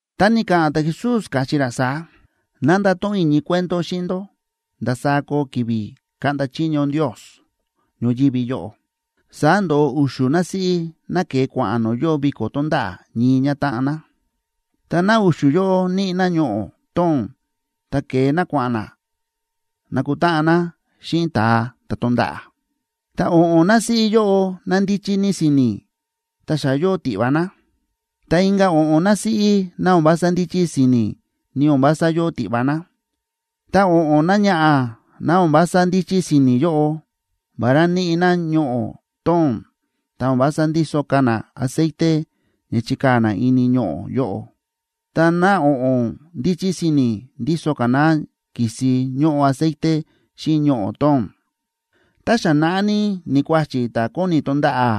Ta ni̱ka̱ꞌa̱n ta̱Jesús, káchí ra saá: ―Ná ndato̱ꞌon i̱ ñii cuento xíꞌin ndó ndasaá koo ki̱vi̱ kaꞌnda chiño Ndios ñoyívi yóꞌo. Saá ndo̱ꞌo u̱xu̱ násíꞌí ná ke̱e kua̱ꞌa̱n no̱o̱ yóo viko̱ tonda̱ꞌa̱ ñii ñátáꞌan ná. Ta ná u̱xu̱ yóꞌo níꞌi ná ñoꞌo̱ tóo̱n ta ke̱e ná kua̱ꞌa̱n ná nakutáꞌan ná xíꞌin ta̱a ta̱ tonda̱ꞌa̱. Ta o̱ꞌo̱n násíꞌí yóꞌo ná ndíchí ní si̱ni̱ ta xa yóo tiꞌva ná, ta inka̱ o̱ꞌo̱n násíꞌí ná o̱n vása ndíchí si̱ni̱ ni o̱n vása yóo tiꞌva ná. Ta o̱ꞌo̱n náñaꞌa̱ ná o̱n vása ndíchí si̱ni̱ yóꞌo, vará níꞌi ná ñoꞌo̱ tóo̱n, ta o̱n vása ndíso ka̱ ná aceite ña chikaa̱ ná ini ñoꞌo̱ yóꞌo. Ta ná o̱ꞌo̱n ndíchí si̱ni̱, ndíso ka̱ ná ki̱si ñóꞌo aceite xíꞌin ñoꞌo̱ tóo̱n. Ta xa naꞌá ní ni̱kuáchi̱ ta̱ kóni tonda̱ꞌa̱,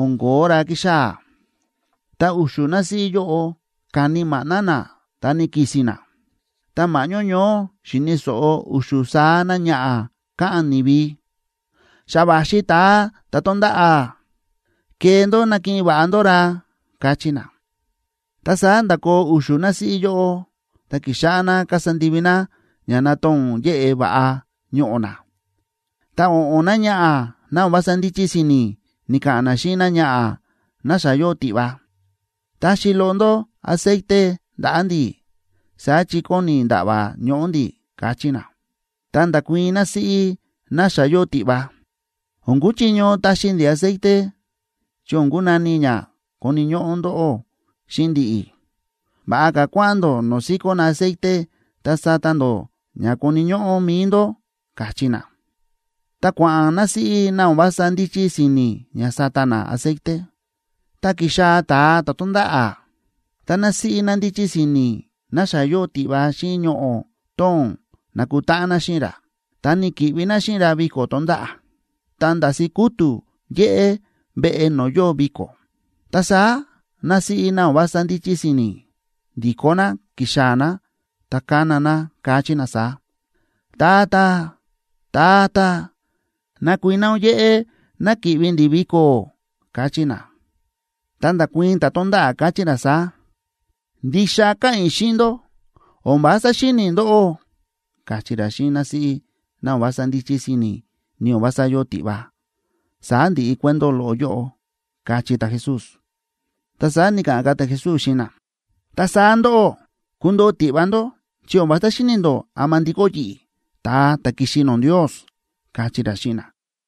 o̱n ko̱ó ra kíxaa̱, ta u̱xu̱ násíꞌí yóꞌo ka̱ni maꞌná ná ta ni̱ki̱si̱n ná. Ta ma̱ꞌñó ñoó xi̱ni̱ so̱ꞌo u̱xu̱ saá náñaꞌa̱ káꞌa̱n ni̱vi: “¡Xa va̱xi ta̱a ta̱ tonda̱ꞌa̱! ¡Kee ndó nakiꞌin va̱ꞌa ndó ra!”, káchí na. Ta saá nda̱koo u̱xu̱ násíꞌí yóꞌo, ta ki̱xáꞌá ná kasa ndivi ná ña natoo̱n yeꞌe va̱ꞌa ñoꞌo̱ ná. Ta o̱ꞌo̱n náñaꞌa̱ ná o̱n vása ndíchí si̱ni̱ ni̱ka̱ꞌa̱n ná xíꞌin náñaꞌa̱ ná xa yóo tiꞌva: “Taxi loꞌo ndó aceite ndaꞌa̱ ndi̱, saá chi kóni nda̱ꞌva̱ ñoꞌo̱ ndi̱”, káchí ná. Ta nda̱kuii̱n násíꞌí ná xa yóo tiꞌva: “O̱n kuchiño taxi ndi̱ aceite, chi o̱n kunani ña koni̱ ñóꞌó ndóꞌó xíꞌin ndi̱ꞌi̱. Va̱ꞌa ka̱ kua̱ꞌa̱n ndó no̱o̱ síkó na aceite ta sata ndó ña koni̱ ñóꞌó mi̱i ndó”, káchí ná. Tá kua̱ꞌa̱n násíꞌí ná o̱n vása ndíchí si̱ni̱ ña sata ná aceite, ta ki̱xaa̱ ta̱a ta̱ tonda̱ꞌa̱. Ta násíꞌí ná ndíchí si̱ni̱ ná xa yóo tiꞌva xíꞌin ñoꞌo̱ tóo̱n na̱kutáꞌan ná xíꞌin ra, ta ni̱ki̱ꞌvi ná xíꞌin ra viko̱ tonda̱ꞌa̱. Ta nda̱si̱ kútu̱ yéꞌé veꞌe no̱o̱ yóo viko̱. Ta saá násíꞌí ná o̱n vása ndíchí si̱ni̱, ndi̱kó ná ki̱xaa̱ ná ta ka̱na ná, káchí ná saá: “¡Tata, Tata, nakuiná ún yéꞌé ná ki̱ꞌvi ndi̱ viko̱!”, káchí ná. Ta nda̱kuii̱n ta̱ tónda̱ꞌa̱, káchí ra saá: “Ndixa káꞌa̱n i̱ xíꞌin ndó, o̱n vása xíni̱ i̱ ndóꞌó”, káchí ra xíꞌin násíꞌí ná o̱n vása ndíchí si̱ni̱ ni o̱n vása yóo tiꞌva. Saá ndi̱ꞌi cuento loꞌo yóꞌo ―káchí ta̱Jesús. Ta saá ni̱ka̱ꞌa̱n ka̱ ta̱Jesús xíꞌin na: ―Ta saá ndóꞌó, kundoo tiꞌva ndó chi o̱n vása xíni̱ ndó ama ndikó yi̱ꞌi̱, ta̱a ta̱ ki̱xi no̱o̱ Ndios ―káchí ra xíꞌin na.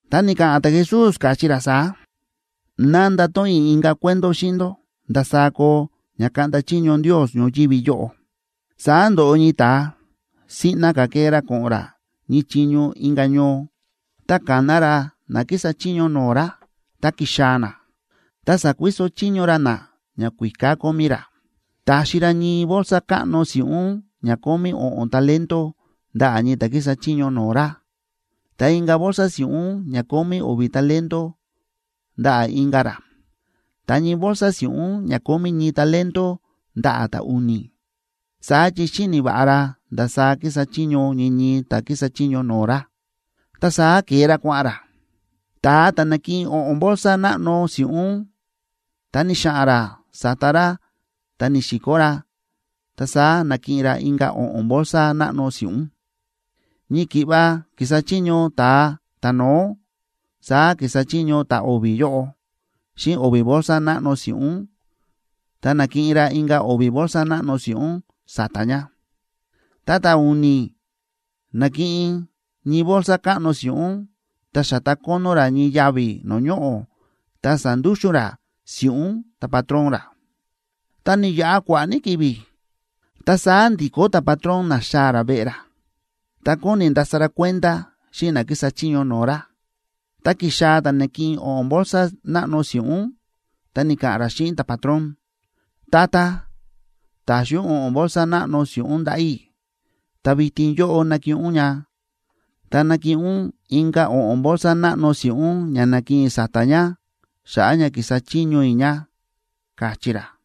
Ta ni̱ka̱ꞌa̱n ta̱Jesús, káchí ra saá: ―Ná ndato̱ꞌon i̱ inka̱ cuento xíꞌin ndó ndasaá koo ña kaꞌnda chiño Ndios ñoyívi yóꞌo. Saá ndo̱ꞌo ñii ta̱a siꞌna ka̱ kee ra ko̱ꞌo̱n ra ñii chiño inka̱ ñoo, ta ka̱na ra na kísa chiño no̱o̱ ra, ta ki̱xaa̱ na, ta sa̱kuiso chiño ra na ñakuíká kómí ra. ’Ta̱xi ra ñii bolsa káꞌno si̱ꞌún ña kómí o̱ꞌo̱n talentoa ndaꞌa̱ ñii ta̱ kísa chiño no̱o̱ ra, ta inka̱ bolsa si̱ꞌún ña kómí o̱vi̱ talento ndaꞌa̱ inka̱ ra, ta ñii bolsa si̱ꞌún ña kómí ñii talento ndaꞌa̱ ta̱u̱ni̱, saá chi xíni̱ va̱ꞌa ra ndasaá kísa chiño ñii ñii ta̱ kísa chiño no̱o̱ ra. Ta saá ke̱e ra kua̱ꞌa̱n ra. Ta̱a ta̱ na̱kiꞌin o̱ꞌo̱n bolsa náꞌno si̱ꞌún, ta ni̱xa̱ꞌa̱n ra sa̱ta ra ta ni̱si̱kó ra, ta saá na̱kiꞌin ra inka̱ o̱ꞌo̱n bolsa náꞌno si̱ꞌún. Ñii ki̱ꞌva ki̱sa chiño ta̱a ta̱no̱ó saá ki̱sa chiño ta̱o̱vi̱ yóꞌo xíꞌin o̱vi̱ bolsa náꞌno si̱ꞌún, ta na̱kiꞌin ra inka̱ o̱vi̱ bolsa náꞌno si̱ꞌún sa̱ta̱ ña. Ta ta̱u̱ni̱ na̱kiꞌin ñii bolsa káꞌno si̱ꞌún, ta xa̱ta kónó ra ñii yavi̱ no̱o̱ ñoꞌo̱, ta sa̱ndúxu̱n ra si̱ꞌún ta̱patrón ra. ’Ta ni̱yaꞌa kua̱ꞌa̱ ní ki̱vi̱, ta saá ndi̱kó ta̱patrón na̱xaa̱ ra veꞌe ra, ta kóni ndasa ra kuenda xíꞌin na kísa chiño no̱o̱ ra. Ta ki̱xaa̱ ta̱ na̱kiꞌin o̱ꞌo̱n bolsa náꞌno si̱ꞌún, ta ni̱ka̱ꞌa̱n ra xíꞌin ta̱patrón: “Tata, ta̱xi ún o̱ꞌo̱n bolsa náꞌno si̱ꞌún ndaꞌa̱ i̱, ta vitin yóꞌo nakiꞌin ún ña, ta nakiꞌin ún inka̱ o̱ꞌo̱n bolsa náꞌno si̱ꞌún ña na̱kiꞌin i̱ sa̱ta̱ ña xa̱ꞌa̱ ña ki̱sa chiño i̱ ña”, káchí ra.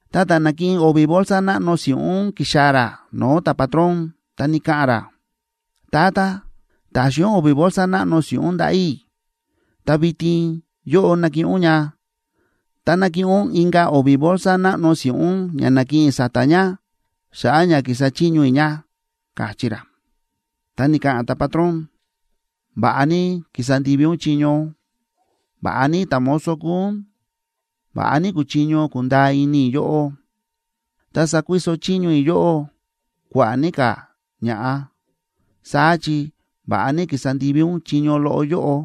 Ta ta̱ na̱kiꞌin o̱vi̱ bolsa náꞌno si̱ꞌún ki̱xaa̱ ra no̱o̱ ta̱patrón, ta ni̱ka̱ꞌa̱n ra: “Tata, ta̱xi ún o̱vi̱ bolsa náꞌno si̱ꞌún ndaꞌa̱ i̱, ta vitin yóꞌo nakiꞌin ún ña, ta nakiꞌin ún inka̱ o̱vi̱ bolsa náꞌno si̱ꞌún ña na̱kiꞌin i̱ sa̱ta̱ ña xa̱ꞌa̱ ña ki̱sa chiño i̱ ña”, káchí ra. Ta ni̱ka̱ꞌa̱n ta̱patrón: “Va̱ꞌa ní ki̱sa ndivi ún chiño. Va̱ꞌa ní ta̱mozo kúu ún. Va̱ꞌa ní kúchiño kundaa ini i̱ yóꞌó. Ta sakuiso chiño i̱ yóꞌó kua̱ꞌa̱ ní ka̱ ña̱ꞌa, saá chi va̱ꞌa ní ki̱sa ndivi ún chiño loꞌo yóꞌo.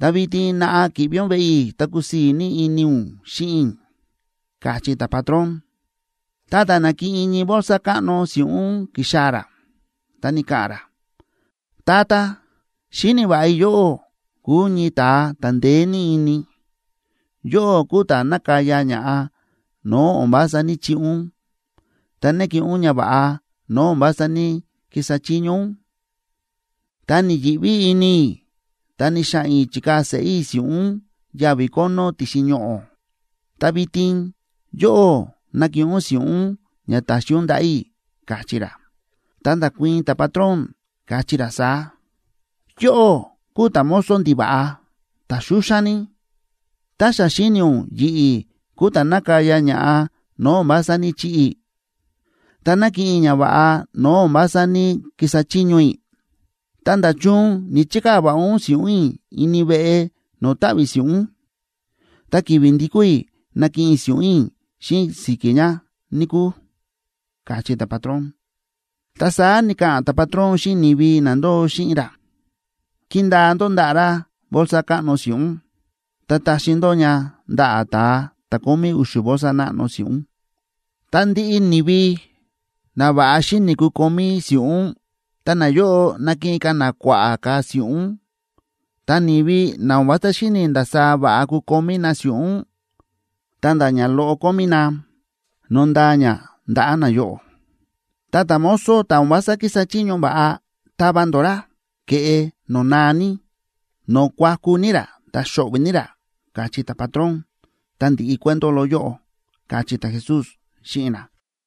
Ta vitin naꞌa ki̱ꞌvi ún veꞌe i̱ ta kusii̱ ní ini ún xíꞌin i̱”, káchí ta̱patrón. Ta ta̱ na̱kiꞌin ñii bolsa káꞌno si̱ꞌún ki̱xaa̱ ra, ta ni̱ka̱ꞌa̱n ra: “Tata, xíni̱ va̱ꞌa i̱ yóꞌó kúu ñii ta̱a ta̱ ndeé ní ini. Yóꞌó kúu ta̱ nákaya ña̱ꞌa no̱o̱ o̱n vása ní‑chiꞌi ún, ta nákiꞌin ún ñava̱ꞌa no̱o̱ o̱n vása ní‑kisa chiño ún. Ta ni̱yi̱ꞌví ini i̱, ta ni̱xa̱ꞌa̱n i̱ chi̱kaa̱ seꞌé i̱ si̱ꞌún ún yavi̱ kónó ti̱xin ñoꞌo̱. Ta vitin yóꞌo nakiꞌin ún si̱ꞌún ún ña ta̱xi ún ndaꞌa̱ i̱”, káchí ra. Ta nda̱kuii̱n ta̱patrón, káchí ra saá: “¡Yóꞌó kúu ta̱mozo ndiva̱ꞌa, ta̱ xúxán ní! Tá xa xíni̱ ún yi̱ꞌi̱ kúu ta̱ nákaya ña̱ꞌa no̱o̱ o̱n vása ní‑chiꞌi i̱, ta nákiꞌin i̱ ñava̱ꞌa no̱o̱ o̱n vása ní‑kisa chiño i̱, ta, ¿nda̱chun ni̱‑chikaa̱ va̱ꞌa ún si̱ꞌún i̱ ini veꞌe no̱o̱ táꞌví si̱ꞌún? Ta ki̱vi̱ ndi̱kó i̱, nakiꞌin i̱ si̱ꞌún i̱ xíꞌin si̱ki̱ ña, níkúu”, káchí ta̱patrón. Ta saá ni̱ka̱ꞌa̱n ta̱patrón xíꞌin ni̱vi na ndóo xíꞌin ra: “Kindaa ndó ndaꞌa̱ ra bolsa káꞌno si̱ꞌún, ta taxi ndó ña ndaꞌa̱ ta̱a ta̱ kómí u̱xu̱ bolsa náꞌno si̱ꞌún. Ta ndiꞌi ni̱vi na va̱ꞌa xíni̱ kukomí si̱ꞌún, ta nayóꞌo nakiꞌin ka̱ na kua̱ꞌa̱ ka̱ si̱ꞌún. Ta ni̱vi na o̱n vása xíni̱ ndasaá va̱ꞌa kukomí na si̱ꞌún, ta̱nda̱ ñaloꞌo kómí na, nondaa ña ndaꞌa̱ nayóꞌo. Ta ta̱mozo ta̱ o̱n vása kísa chiño va̱ꞌa, tava ndó ra ke̱ꞌe no̱o̱ naa ní, no̱o̱ kuaku ní ra ta xo̱ꞌvi̱ ní ra”, káchí ta̱patrón. Ta ndi̱ꞌi cuento loꞌo yóꞌo ―káchí ta̱Jesús xíꞌin na.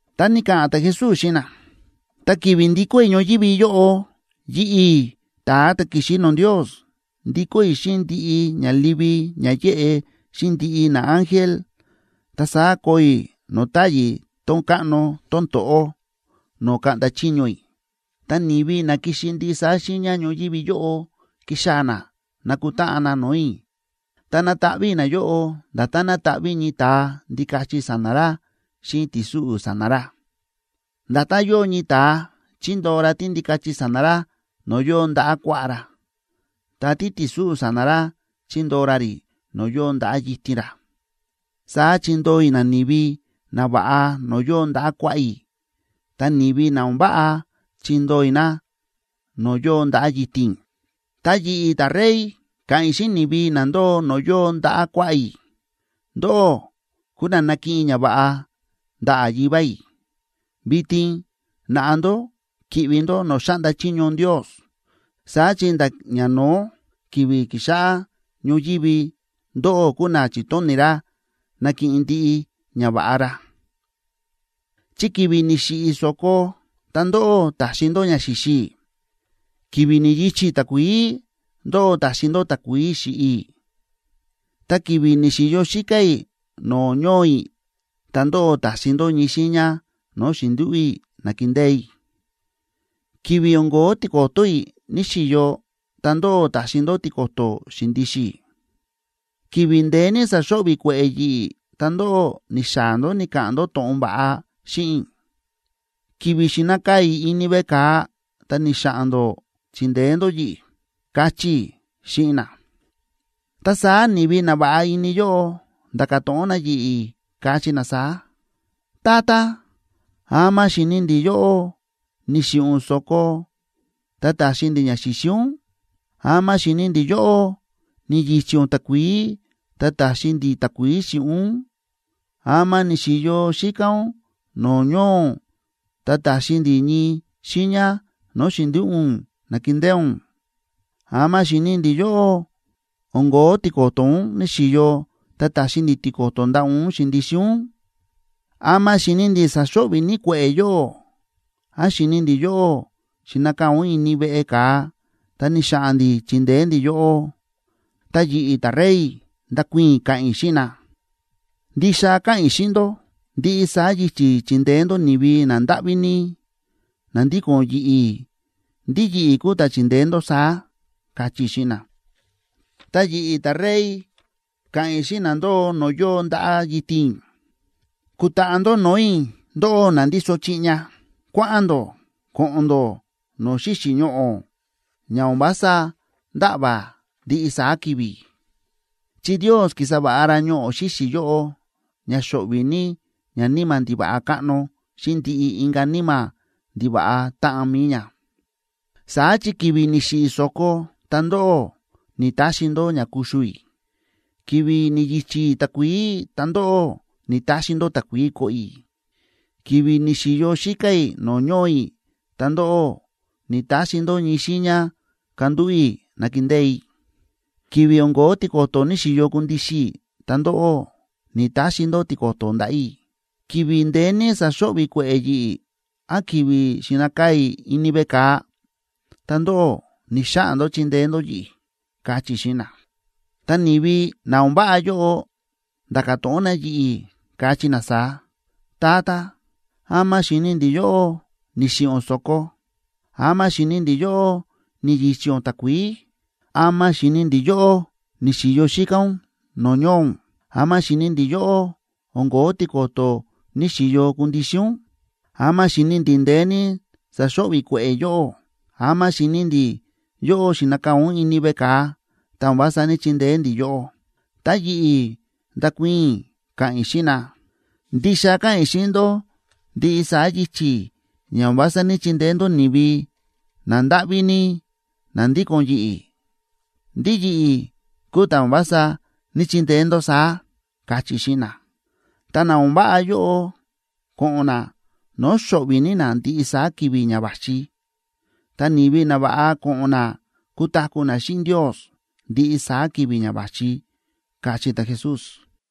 Ta ni̱ka̱ꞌa̱n ta̱Jesús xíꞌin na: ―Ta ki̱vi̱ ndikó i̱ ñoyívi yóꞌo, yi̱ꞌi̱, ta̱a ta̱ ki̱xi no̱o̱ Ndios, ndikó i̱ xíꞌin ndiꞌi ña livi ña yéꞌe, xíꞌin ndiꞌi naángel, ta saá koo i̱ no̱o̱ táyi̱ tón káꞌno tón to̱ꞌó no̱o̱ kaꞌnda chiño i̱. Ta ni̱vi na kixi ndiꞌi saá xiiña ñoyívi yóꞌo kixaa̱ na nakutáꞌan na no̱o̱ i̱, ta nataꞌví i̱ nayóꞌo nda̱tán nátaꞌví ñii ta̱a ndikachi sa̱na̱ ra xíꞌin ti̱súꞌu̱ sa̱na̱ ra. Nda̱tán yóo ñii ta̱a chíndoo ra tíndikachi sa̱na̱ ra no̱o̱ yóo ndaꞌa̱ kuaꞌá ra, ta títi̱súꞌu̱ sa̱na̱ ra chíndoo ra rí no̱o̱ yóo ndaꞌa̱ yitin ra, saá chindoo i̱ nani̱vi nava̱ꞌa no̱o̱ yóo ndaꞌa̱ kuaꞌá i̱ ta ni̱vi na o̱n váꞌa chindoo i̱ na no̱o̱ yóo ndaꞌa̱ yitin i̱. Ta yi̱ꞌi̱, ta̱Rey, ka̱ꞌa̱n i̱ xíꞌin ni̱vi na ndóo no̱o̱ yóo ndaꞌa̱ kuaꞌá i̱: “Ndóꞌó kúu na nakiꞌin ñava̱ꞌa ndaꞌa̱ Yivá i̱. Vitin naꞌa ndó ki̱ꞌvi ndó no̱o̱ xáꞌnda chiño Ndios, saá chi nda̱ ñano̱ó ki̱vi̱ ki̱xáꞌá ñoyívi ndóꞌó kúu na chi̱tóni̱ ra nakiꞌin ndiꞌi ñava̱ꞌa ra. Chi ki̱vi̱ ni̱xiꞌi̱ i̱ so̱ko ta ndóꞌó ta̱xi ndó ña xi̱xi i̱. Ki̱vi̱ ni̱yi̱chi̱ i̱ takuií ndóꞌó ta̱xi ndó takuií xi̱ꞌi i̱. Ta ki̱vi̱ ni̱xi̱yo xíká i̱ no̱o̱ ñoo i̱, ta ndóꞌó ta̱xi ndó ñii xiiña no̱o̱ xi̱ndúꞌu̱ i̱ na̱kindée i̱. Ki̱vi̱ o̱n ko̱ó tiko̱to̱ i̱ ni̱‑xiyo, ta ndóꞌó ta̱xi ndó tiko̱to̱ xi̱ndixin i̱. Ki̱vi̱ ndeé ní sa̱xo̱ꞌvi̱ kue̱ꞌe̱ yi̱ꞌi̱ ta ndóꞌó ni̱xaa̱ ndó ni̱ka̱ꞌa̱n ndó to̱ꞌon va̱ꞌa xíꞌin i̱. Ki̱vi̱ xi̱nakaa̱ i̱ ini veꞌe ka̱a ta ni̱xa̱ꞌa̱n ndó chi̱ndeé ndó yi̱ꞌi̱”, kachí i̱ xíꞌin na. Ta saá ni̱vi na va̱ꞌa ini yóꞌo nda̱ka̱ to̱ꞌon na yi̱ꞌi̱, kachí na saá: “Tata, ¿ama xi̱ni ndi̱ yóꞌó ni̱xiꞌi̱ ún so̱ko ta ta̱xi ndi̱ ña xi̱xi ún? ¿Ama xi̱ni ndi̱ yóꞌó ni̱yi̱chi̱ ún takuií ta ta̱xi ndi̱ takuií xi̱ꞌi ún? ¿Ama ni̱xi̱yo xíká ún no̱o̱ ñoo ún ta ta̱xi ndi̱ ñii xiiña no̱o̱ xi̱ndúꞌu̱ ún na̱kindée ún? ¿Ama xi̱ni ndi̱ yóꞌó o̱n ko̱ó tiko̱to̱ ún ni̱‑xiyo ta ta̱xi ndi̱ tiko̱to̱ ndaꞌa̱ ún xi̱ndixin ún? ¿Ama xi̱ni ndi̱ sa̱xo̱ꞌvi̱ ní kue̱ꞌe̱ yóꞌó, án xi̱ni ndi̱ yóꞌó xi̱nakaa̱ ún ini veꞌe ka̱a ta ni̱xa̱ꞌa̱n ndi̱ chi̱ndeé ndi̱ yóꞌó?” Ta yi̱ꞌi̱, ta̱Rey, ndakuii̱n i̱, ka̱ꞌa̱n i̱ xíꞌin na: “Ndixa káꞌa̱n i̱ xíꞌin ndó, ndiꞌi saá yichi̱ chi̱ndeé ndó ni̱vi nandáꞌví ní na ndíko̱n yi̱ꞌi̱, ndí yi̱ꞌi̱ kúu ta̱ chi̱ndeé ndó saá”, kachí i̱ xíꞌin na. ’Ta yi̱ꞌi̱, ta̱Rey, ka̱ꞌa̱n i̱ xíꞌin na ndóo no̱o̱ yóo ndaꞌa̱ yitin i̱: “Kutaꞌa ndó no̱o̱ i̱, ndóꞌó na ndíso chiꞌña. Kua̱ꞌa̱n ndó koꞌon ndó no̱o̱ xíxi̱ ñoꞌo̱ ña o̱n vása nda̱ꞌva̱ ndiꞌi saá ki̱vi̱, chi Ndios ki̱sa va̱ꞌa ra ñoꞌo̱ xíxi̱ yóꞌo ña xo̱ꞌvi̱ ní ñaníma̱ ndiva̱ꞌa káꞌno xíꞌin ndiꞌi inka̱ níma̱ ndiva̱ꞌa táꞌan mi̱i ña. Saá chi ki̱vi̱ ni̱xiꞌi̱ i̱ so̱ko ta ndóꞌó ni̱‑taxi ndó ña kuxu i̱. Ki̱vi̱ ni̱yi̱chi̱ i̱ takuií, ta ndóꞌó ni̱‑taxi ndó takuií koꞌo i̱. Ki̱vi̱ ni̱xi̱yo xíká i̱ no̱o̱ ñoo i̱, ta ndóꞌó ni̱‑taxi ndó ñii xiiña kandúꞌu̱ i̱ nakindée i̱. Ki̱vi̱ o̱n ko̱ó tiko̱to̱ ni̱xi̱yo kundixin i̱, ta ndóꞌó ni̱‑taxi ndó tiko̱to̱ ndaꞌa̱ i̱. Ki̱vi̱ ndeé ní sa̱xo̱ꞌvi̱ kue̱ꞌe̱ yi̱ꞌi̱ án ki̱vi̱ xi̱nakaa̱ i̱ ini veꞌe ka̱a ta ndóꞌó ni̱‑xaꞌa̱n ndó chindeé ndó yi̱ꞌi̱”, kachí i̱ xíꞌin na. Ta ni̱vi na o̱n váꞌa yóꞌo nda̱ka̱ to̱ꞌon na yi̱ꞌi̱, kachí na saá: “Tata, ¿ama xi̱ni ndi̱ yóꞌó ni̱xiꞌi̱ ún so̱ko? ¿Ama xi̱ni ndi̱ yóꞌó ni̱yi̱chi̱ ún takuií? ¿Ama xi̱ni ndi̱ yóꞌó ni̱xi̱yo xíká ún no̱o̱ ñoo ún? ¿Ama xi̱ni ndi̱ yóꞌó o̱n ko̱ó tiko̱to̱ ni̱xi̱yo kundixin ún? ¿Ama xi̱ni ndi̱ ndeé ní sa̱xo̱ꞌvi̱ kue̱ꞌe̱ yóꞌó?, ¿ama xi̱ni ndi̱ yóꞌó xi̱nakaa̱ ún ini veꞌe ka̱a, ta o̱n vása ní‑chindeé ndi̱ yóꞌó?” Ta yi̱ꞌi̱ ndakuii̱n i̱, ka̱ꞌa̱n i̱ xíꞌin na: “Ndixa káꞌa̱n i̱ xíꞌin ndó, ndiꞌi saá yichi̱ ña o̱n vása ní‑chindeé ndó ni̱vi nandáꞌví ní na ndíko̱n yi̱ꞌi̱, ndí yi̱ꞌi̱ kúu ta̱ o̱n vása ní‑chindeé ndó saá”, kachí i̱ xíꞌin na. Ta na o̱n váꞌa yóꞌo ko̱ꞌo̱n na no̱o̱ xo̱ꞌvi̱ ní na ndiꞌi saá ki̱vi̱ ña va̱xi, ta ni̱vi nava̱ꞌa ko̱ꞌo̱n na kutaku̱ na xíꞌin Ndios ndiꞌi saá ki̱vi̱ ña va̱xi ―káchí ta̱Jesús.